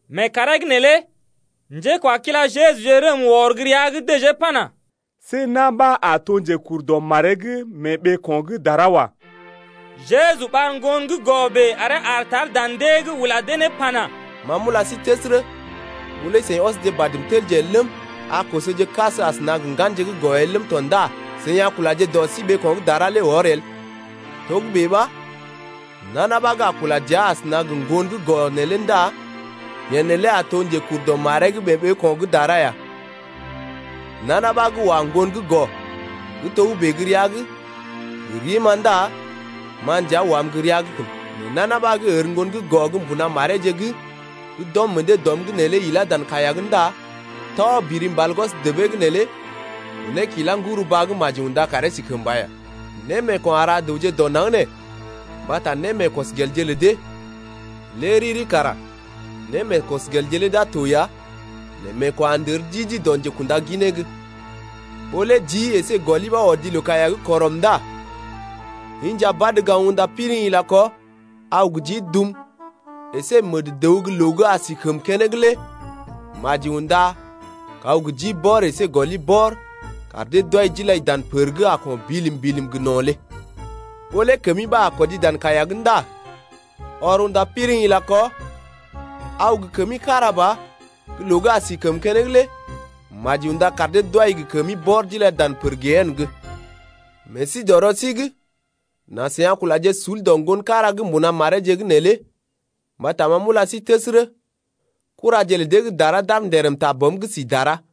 Mee kàree’g neelé njékwakila Jejuje rəm wɔr gə́ rəa’g dəjee pana: See na̰ ɓa a to njekur dɔ maree’g mee ɓeeko̰ gə́ dara wa. Jeju ɓar ŋgon gə́ gɔ bèe aree aar tar dan dee’g ula dee ne pana: Ma m’ula sí təsərə, ɓó lé seḭ ɔsje badm telje el ləm, a kosoje kas asəna gə ŋganje gə́ gɔ el ləm tɔ ndá seḭ a kulaje dɔ sí ɓeeko̰ gə́ dara lé wɔr el. Togə́bè ɓa nana ɓa gə́ a kula dəa asəna gə ŋgon gə́ gɔ neelé ndá yeḛ neelé a to njekur dɔ maree’g mee ɓeeko̰ gə́ dara ya. Nana ɓa gə́ wa ŋgon gə́ gɔ gə́ togə́bè gə́ rəa’g gə rim-ma ndá ma nja wam gə́ rəa’g kən. Nɛ nana ɓa gə́ ər ŋgon gə́ gɔ gə́ mbuna mareeje gə́ d’ɔm meḛ dee dɔm’g neelé ilá dan kaiya’g ndá tɔ biri mbal gwɔs debee gə́ neelé kunee kilá ŋgɔrəw-baa’g, maji unda karee si kəmba ya. Némeeko̰ a ra dəwje dɔ naŋg nee mbata némeekɔsgelje lə dee. Lé riri kara némeekɔsgelje lé d’a to ya nɛ meeko̰ a ndər di-di dɔ njekunda ginee’g. Ɓó lé jii əsé gɔli ɓa odi loo-kaiya’g kɔrəm ndá inja badə gaŋg unda piriŋ ila kɔ, aw gə jii dum əsé məd-dəw gə́ loo gə́ a si gə kəmə keneŋ lé maji unda kaw gə jii bɔr əsé gɔli bɔr kar dee d’wai d’ilai dan pər gə́ a ko̰ bilim-bilim gə no̰ lé. Ɓó lé kəmi ɓa a kɔdi dan kaiya’g ndá ɔr unda piriŋ ila kɔ, aw gə kəmi kára ba gə́ loo gə́ a si gə kəmə keneŋ lé maji unda kar dee d’wai gə kəmi bɔr d’ilai ne dan pər gehene’g. Meḛ sí dɔ rɔ sí’g nà seḭ a kulaje sul dɔ ŋgon kára gə́ mbuna mareeje’g neelé mbata ma m’ula sí təsərə, kuraje lə dee gə́ dara d’aar nderəm ta Bɔm gə́ si dara lé.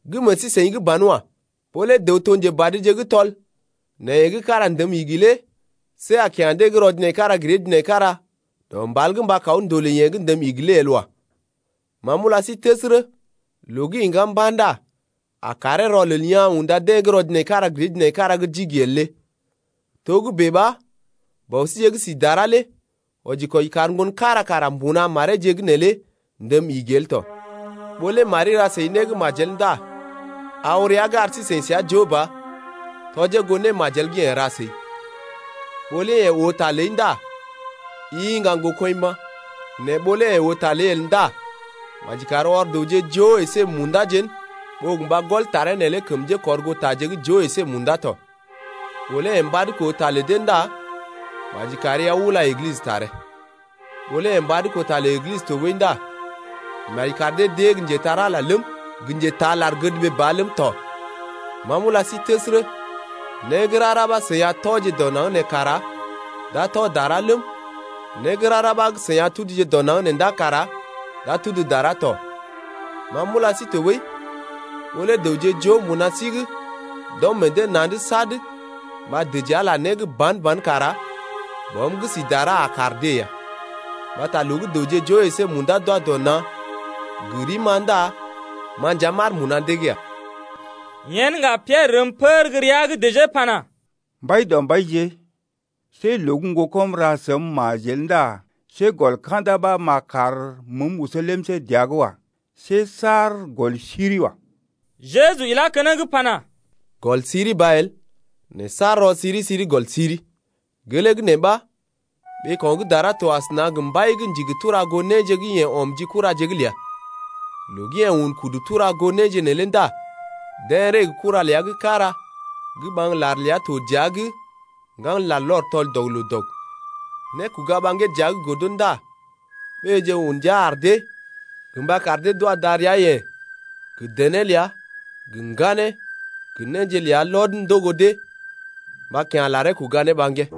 Gə́ meḛ sí-seḭ’g banwa. Ɓó lé dəw to njebadje gə́ tɔl nɛ yeḛ gə́ kára ndəm igi lé see a kya̰ deḛ gə́ rɔ-jinaikara-gir-dee-jinaikara dɔ mbal’g mba kaw ndolè yeḛ gə́ ndəm igi lé el wa. Ma m’ula sí təsərə, loo gə́ iŋgá mba̰ ndá a karee rɔlel yaa̰ unda deḛ gə́ rɔ-jinaikara-gir-dee-jinaikara gə́ d’igi el lé. Togə́bè ɓa Bɔ síje gə́ si dara lé wɔji-kwɔji kar ŋgon kára kara mbuna mareeje’g neelé ndəm igi el tɔ. Ɓó lé mari ra səi né gə́ majel ndá aw rəa’g ar sí-seḭ səa joo ba tɔjee goo némajel gə́ yeḛ ra səi. Ɓó lé yeḛ oo ta ləi ndá i iŋga ŋgokɔḭ mba̰. Nɛ ɓó lé yeḛ oo ta ləi el ndá maji kari ɔr dəwje joo əsé munda jén ɓó gə mba gɔl taree neelé kəm njékɔrgootaje gə́ joo əsé munda tɔ. Ɓó lé yeḛ mbad koo ta lə dee ndá maji kari aw ula églisə taree. Ɓó lé yeḛ mbad koo ta lə églisə tɔɓəi ndá maji kar dee d’ée gə́ njetar-Ala ləm, gə njetaa lar-gədɓee ba ləm tɔ. Ma m’ula sí təsərə, né gə́ rara ɓa gə́ seḭ a tɔje dɔ naŋg nee kara d’a tɔ dara ləm, né gə́ rara ɓa gə́ seḭ a tuduje dɔ naŋg nee ndá kara d’a tudu dara tɔ. Ma m’ula sí tɔɓəi, ɓó lé dəwje joo mbuna sí’g d’ɔm meḛ dee na̰’d sad mba dəji Ala né gə́ ban-ban kara Bɔm gə́ si dara a kar dee ya. Mbata loo gə́ dəwje joo əsé munda d’wa dɔ na̰ gə rim-ma ndá ma nja m’aar mbuna dee’g ya. Yen ŋga Piɛrə rəm pər gə́ rəa’g dəjee pana: Mbaidɔmbaije, see loo gə́ ŋgokɔm ra səm majel ndá see gɔl ka̰da ɓa m’a kar məəm oso lemsé dəa’g wa. See saar gɔl siri wa. Jeju ilá keneŋ pana: Gɔl siri ba el, nɛ saar rɔ-siri-siri gɔl siri. Gelee gə́ nee ɓa ɓeeko̰ gə́ dara to asəna gə mbai gə́ ndigi tura goo néje gə́ yeḛ ɔm ji kuraje’g ləa. Loo gə́ yeḛ un kudu tura goo néje neelé ndá deḛ ree gə kura ləa gə́ kára gə́ ɓaŋg lar ləa to dəa’g ŋgan larlɔr tɔl-dɔg-loo-dɔg. Nékoga ɓaŋgee dəa’g godo ndá ɓéeje un ndia ar dee gə mba kar dee d’wa darəa-yeḛ gə dené ləa gə ŋganeeje gə néje ləa lɔd ndogo dee mba kya̰ laree kuga ne ɓaŋgee.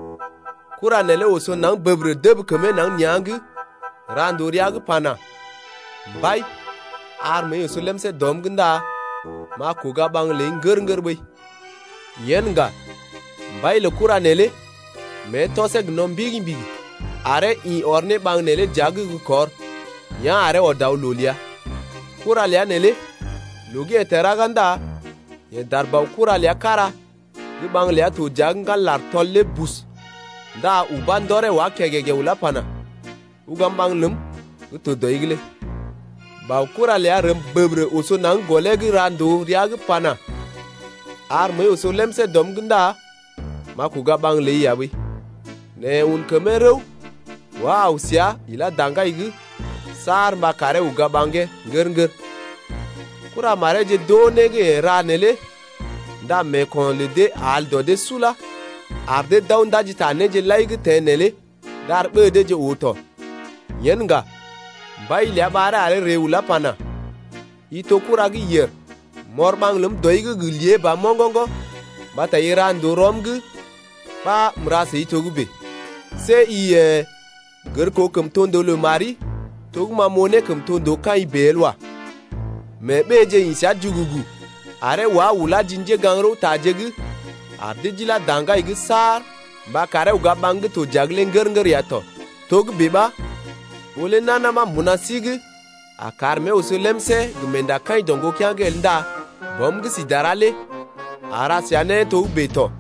Kura neelé oso naŋg bəbərə dəb kəmee naŋg nea̰’g ra ndòo rəa’g pana: Mbai, ar məəi oso lemsé dɔm’g ndá m’a kuga ɓaŋg ləi ŋgər-ŋgər ɓəi. Yen ŋga mbai lə kura neelé mée tɔsee gə no̰ mbigi-mbigi aree ḭ ɔr ne ɓaŋg neelé dəa’g gə́ kɔr, yá̰ aree ɔd aw loo ləa. Kura ləa neelé loo gə́ yeḛ teḛ ɗaga ndá yeḛ dar baokura ləa kára gə́ ɓaŋg ləa to dəa’g ŋgan lar gə́ ndá tɔl lé bus ndá ubá ndɔree wá kègègè ulá pana: Ugam ɓaŋg ləm gə́ to dɔi’g lé. Baokura ləa rəm bəbərə oso naŋg gɔlee’g ra ndòo rəa’g pana: Ar məəi oso lemsé dɔm’g ndá m’a kogai ɓaŋg ləi ya ɓəi. Nɛ yeḛ un kəmee rəw, wá aw səa ilá daŋgai’g saar mba karee uga ɓaŋgee ŋgər-ŋgər. Kuramareeje d’oo né gə́ yeḛ ra neelé ndá meeko̰ lə dee al dɔ dee sula, ar dee d’aw ndaji ta néje lai gə́ teḛ neelé d’ar ɓée deeje oo tɔ. Yen ŋga mbai ləa ɓaree aree ree ulá pana: I to kura gə́ yèr. M’ɔr ɓaŋg ləm dɔi’g gə lée ba moŋgoŋgo̰ mbata i ra ndòo rɔm’g ɓa m’ra səi togə́bè. See i yḛ̀ gər koo kəmtondoo lə mari to gə́ ma m’oo ne kəmtondoo kaḭ bèe lé el wa. Mee ɓéeje ḭ səa jugugu, aree wá ulá ji njégaŋ-rəwtaje’g ar dee d’ilá daŋgai’g saar mba karee uga ɓaŋg gə́ to dəa’g lé ŋgər-ŋgər ya tɔ. Togə́bè ɓa ɓó lé nana ɓa mbuna sí’g a kar mée oso lemsé gə meendakaḭ dɔ ŋgokea̰’g el ndá Bɔm gə́ si dara lé a ra səa né togə́bè tɔ.